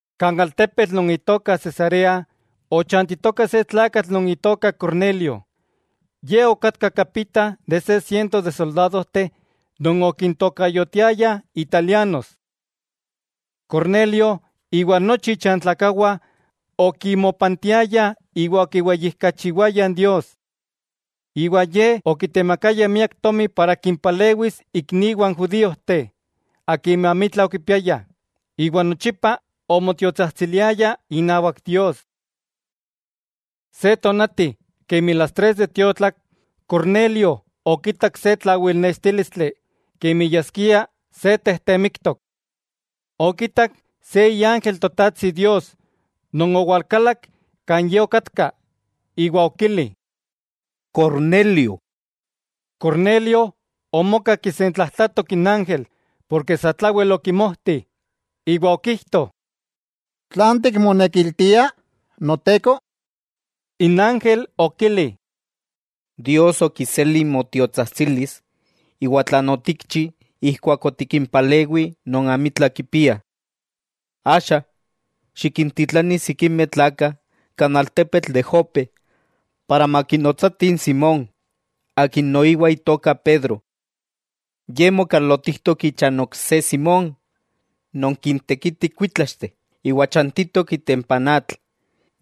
Kan altepetl non itoka Cesarea ochantitoka se tlakatl non itoka Cornelio, ye kapita innawak se siento de soldadojteh non okintokayotiayah Italianos. Cornelio iwa nochi ichantlakawah okimopantiayah iwa okiweyijkachiwayah Dios. Iwa Ye okitemakaya miak tomi para kimpalewis ikniwah n judíojteh akimeh amitla okipiayah, iwa nochipa omotiotsajtsiliaya inawak Dios. Se tonati kemi las tres de tiotlak, Cornelio okitak se tlawilnextílistli kemi yaskia se tejtemiktok. Okitak se iángel Totajtsi Dios non owalkalak kan ye okatka, iwa okili: —¡Cornelio! Cornelio omoka kisentlajtlatok n ángel porke satlawel okimojti, iwa okijto: —¿Tlan tikmonekiltia Noteko? N ángel okili: —Dios okiseli motiotsajtsilis iwa tlan otikchi ijkuak otikimpalewi non amitla kipiah. Axa, xikintitlani sikimeh tlakah kan altepetl de Jope para makinotsatih n Simón, akin noiwa itoka Pedro. Ye mokalotijtok icha n ok se Simón, non kintekiti kuítlaxteh, iwa chantitok itempa n atl,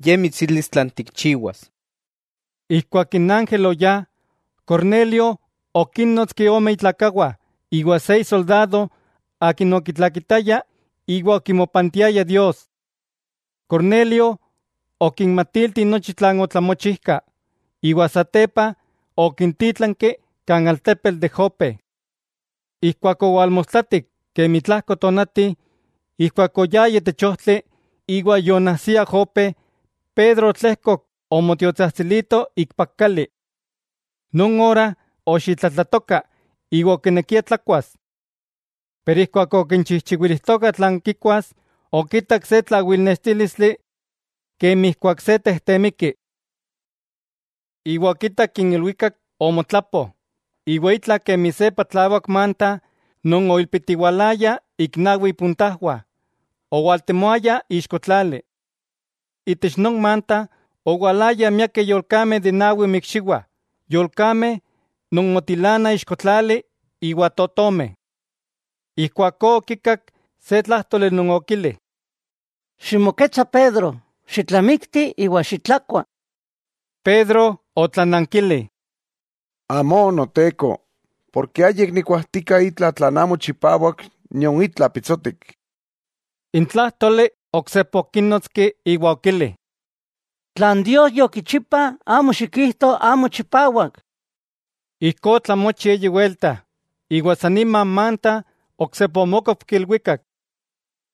ye mitsilis tlan tikchiwas. Ijkuak n ángel oyá, Cornelio okínnotski ome itlakawah iwa se isoldado akin okitlakitaya iwa okimopantiaya Dios. Cornelio okinmatilti nochi tlan otlamochijka, iwa satepa okintítlanki kan altepetl de Jope. Ijkuak owalmostlatik kemi tlajko tonati, ijkuak oyayah itech ojtli iwa yoonajsiah Jope, Pedro otlejkok omotiotsajtsilito ikpak kali. Non ora oxitlatlatoka iwa okinekia tlakuas. Pero ijkuak okichijchiwilijtokah tlan kikuas, okitak se tlawilnextílistli kemi ijkuak se tejtemiki, iwa okitak n ilwikak omotlapo iwa itla kemi se patlawak manta non oilpitiwalaya ik nawi ipuntajwah, owaltemoaya ixko tlali. Itech non manta owalayah miakeh yolkameh de nawi inmikxiwah, yolkameh non motilanah ixko tlali iwa totomeh. Ijkuakó okikak se tlájtoli non okili: —Ximoketsa Pedro, xitlamikti iwa xitlakua. Pedro otlanankili: —Amó, Noteko, porke ayik nikuajtika itla tlan amo chipawak nion itla pitsotik. N tlájtoli oksepa okínotski iwa okili: —Tlan Dios yokichipa, amo xikijto amo chipawak. Ijkó otlamochi eyi welta, iwa san nima n manta oksepa omókopki ilwikak.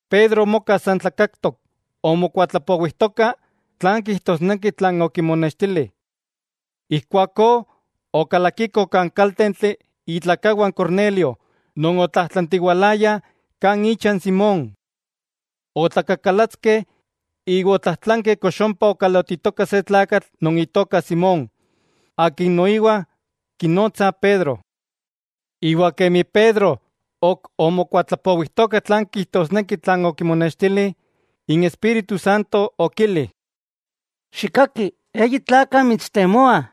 Pedro omoka san tlakaktok, omokuatlapowijtoka tlan kijtosneki tlan okimonextili. Ijkuakó okalakikoh kan kaltentli itlakawah n Cornelio non otlajtlantiwalayah kan icha n Simón. Otlakakalatskeh iwa otlajtlankeh kox ompa okalotitoka se tlakatl non itoka Simón, akin noiwa kinotsah Pedro. Iwa kemi Pedro ok omokuatlapowijtoka tlan kijtosneki tlan okimonextili, n Espíritu Santo okili: —Xikkaki, eyi tlakah mitstemoah.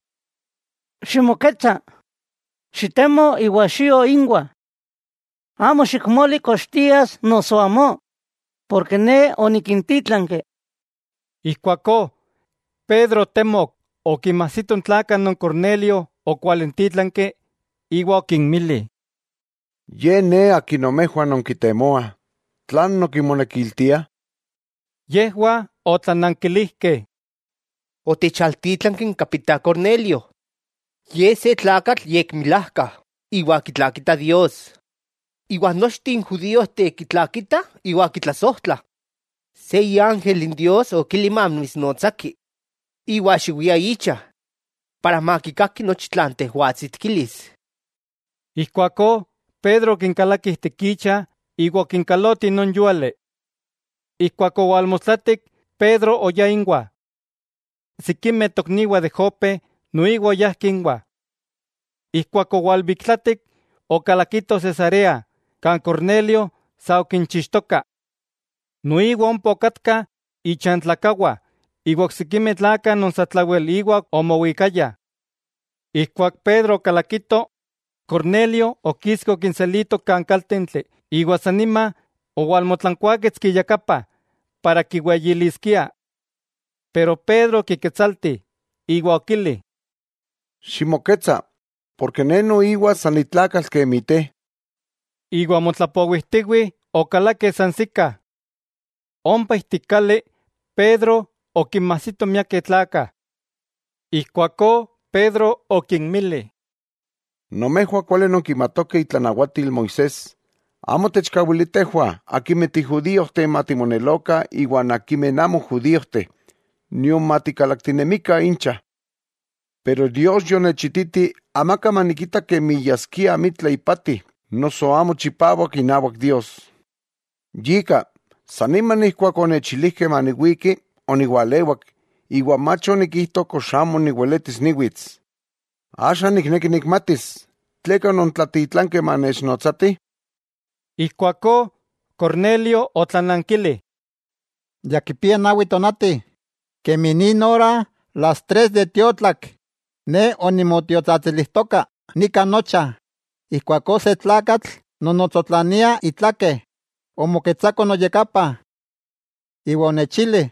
Ximoketsa, xitemo iwa xio inwah. Amo xikmoli kox tias noso amó, porke Ne onikintítlanki. Ijkuakó Pedro otemok okinmajsito n tlakah non Cornelio okwalintítlanki, iwa okinmili: —Ye ne akin nomejwah nonkitemoah, ¿tlan nonkimonekiltiah? Yejwah otlanankilijkeh: —Otechaltítlanki n kapita Cornelio. Ye se tlakatl yekmilajka iwa kitlakita Dios, iwa nochteh n judíojteh kitlakitah iwa kitlasojtlah. Se iángel Dios okili mamitsnotsaki iwa xiwia icha, para makikaki nochi tlan tejwatsi tikilis. Ijkuakó Pedro okinkalaki ijtik icha iwa okinkaloti non yúali. Keman owalmostlatik Pedro oyá inwah. Sikimeh tokniwah de Jope noiwa oyajkeh inwah. Ijkuak owalbiktlatik okalakitoh Cesarea kan Cornelio sa okinchixtoka. Noiwa ompa okatka ichantlakawah iwa oksikimeh tlakah non satlawel íwa omowikaya. Ijkuak Pedro okalakito, Cornelio okiski okinselito kan kaltentli iwa san nima owalmotlankuáketski iyakapa para kiweyiliskia. Pero Pedro okiketsalti, iwa okili: —Ximoketsa, porke ne noiwa san ni tlakatl kemi te. Iwa motlapowijtiwih okalakeh sansikah. Ompa ijtik kali Pedro okinmajsito miakeh tlakah. Ijkuakó Pedro okinmili: —Nomejwah kuali nonkimatokeh itlanawatil Moisés amo techkawilia tejwah akimeh ti judíojteh matimonelokah iwa akimeh amo judíojteh, nion matikalaktinemikah incha. Pero Dios yonechititi amaka manikita kemi yaskia amitla ipati noso amo chipawak inawak Dios. Yika, san nima ijkuak onechilijkeh maniwiki oniwalewak iwa mach onikijto kox amo niweletis niwits. Axa nikneki nikmatis, tleka onontlatitlankeh manechnotsatih. Ijkuakó Cornelio otlanankili: —Ya kipia nawi tonati, kemi nin ora las tres de tiotlak, ne onimotiotsajtsilijtoka nika nocha, ijkuakó se tlakatl non otsotlania itlakeh, omoketsako noyakapa. Iwa onechili: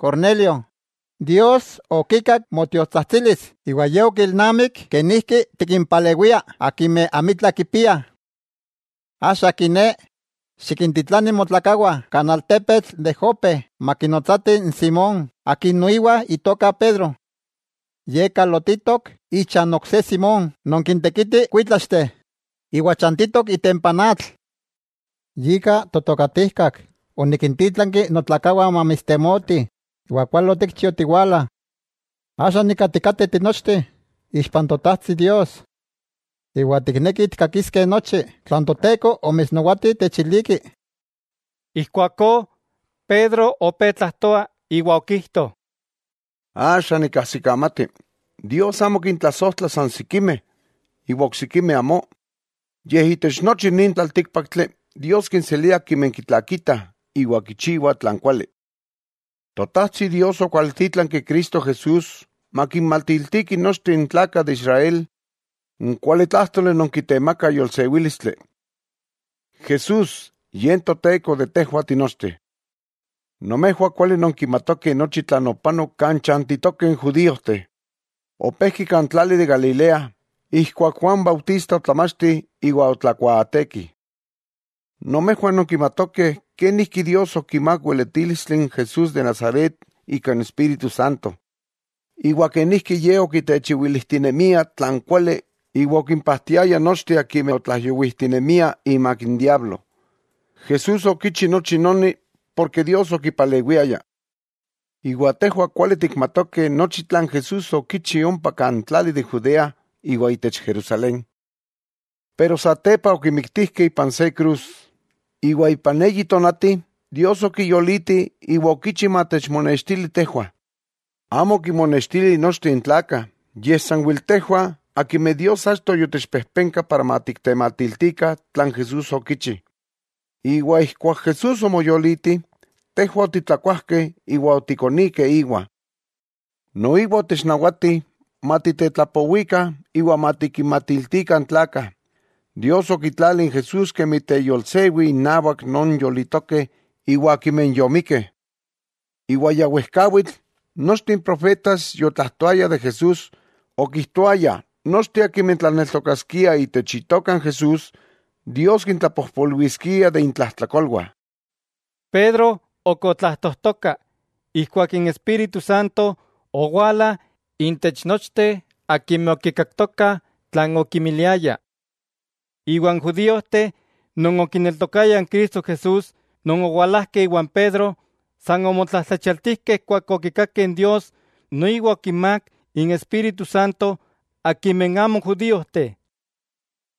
“Cornelio, Dios okikak motiotsajtsilis iwa Ye okilnamik kenijki tikimpalewia akimeh amitla kipiah. Axa kiné, xikintitlani motlakawah kan altepetl de Jope makinotsatih n Simón akin noiwa itoka Pedro. Ye kalotitok icha n ok se Simón non kintekiti kuitlaxteh iwa chantitok itempa n atl.” Yika totokatijkak onikintítlanki notlakawah mamitstemotih, iwa kuali otikchi otiwala. Axa nika tikateh tinochteh ixpa n Totajtsi Dios, iwa tiknekih tikkakiskeh nochi tlan Toteko omitsnawati techiliki. Ijkuakó Pedro opé tlajtoa iwa okijto: —Axa nikajsikamati, Dios amo kintlasojtla san sikimeh, iwa oksikimeh amó, yej itech nochi nin tlaltíkpaktli, Dios kinselia akimeh kitlakitah iwa kichiwah tlan kuali. Totajtsi Dios okwaltítlanki Cristo Jesús makinmatiltiki nochteh n tlakah de Israel n kualitlájtoli non kitemakah yolsewílistli, Jesús Ye n Toteko de tejwah tinochteh. Nomejwah kuali nonkimatokeh nochi tlan opanok kan chantitokeh n judíojteh. Opejki kan tlali de Galilea, ijkuak Juan Bautista otlamachti iwa otlakuaateki. Nomejwah nonkimatokeh kenijki Dios okimák weletílistli n Jesús de Nazaret ika n Espíritu Santo, iwa kenijki Ye okitechiwilijtinemia tlan kuali iwa okimpajtiaya nochteh akimeh otlaijyowijtinemia imak n diablo. Jesús okichi nochi noni porke Dios okipalewiaya. Iwa tejwah kuali tikmatokeh nochi tlan Jesús okichi ompa kan tlali de Judea iwa itech Jerusalén. Pero satepa okimiktijkeh ipan se krus. Iwa ipan eyi tonati, Dios okiyoliti iwa okichi matechmonextili tejwah. Amo okinmonextili nochteh n tlakah, yej sanwel tejwah akimeh Dios achto yotechpejpenka para matiktematiltikah tlan Jesús okichi. Iwa ijkuak Jesús omoyoliti, tejwah otitlakuajkeh iwa otikonikeh íwa. Noiwa otechnawati matitetlapowikah iwa matikinmatiltikah n tlakah, Dios okitlali n Jesús kemi teyolsewi innawak non yolitokeh iwa akimeh yomikkeh. Iwa ya wejkawitl, nochteh n profetas yotlajtoayah de Jesús, okijtoayah nochteh akimeh tlaneltokaskiah itech Itoka n Jesús, Dios kintlapojpolwiskia de intlajtlakolwah. Pedro ok otlajtojtoka ijkuak n Espíritu Santo owala intech nochteh akimeh okikaktokah tlan okimiliaya. Iwa n judíojteh non okineltokayah Cristo Jesús non owalajkeh iwan Pedro, san omotlajtlachialtijkeh ijkuak okitakeh Dios noiwa okinmák n Espíritu Santo akimeh amo judíojteh.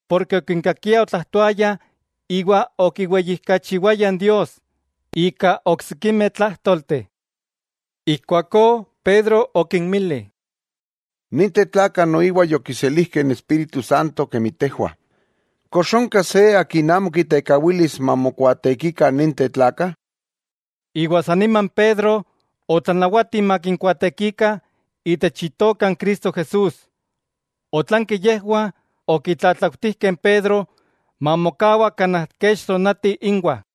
Porke okinkakiah otlajtoayah iwa okiweyijkachiwayah Dios ika oksikimeh tlájtolteh. Ijkuakó Pedro okinmili: —Ninteh tlakah noiwa yokiselijkeh n Espíritu Santo kemi tejwah, ¿kox onka se akin amo kitekawilis mamokuaatekikah ninteh tlakah? Iwa san nima Pedro otlanawati makinkuaatekikah itech Itoka n Cristo Jesús. Otlanki yejwah okitlatlautijkeh n Pedro mamokawa kanaj kech tonati inwah.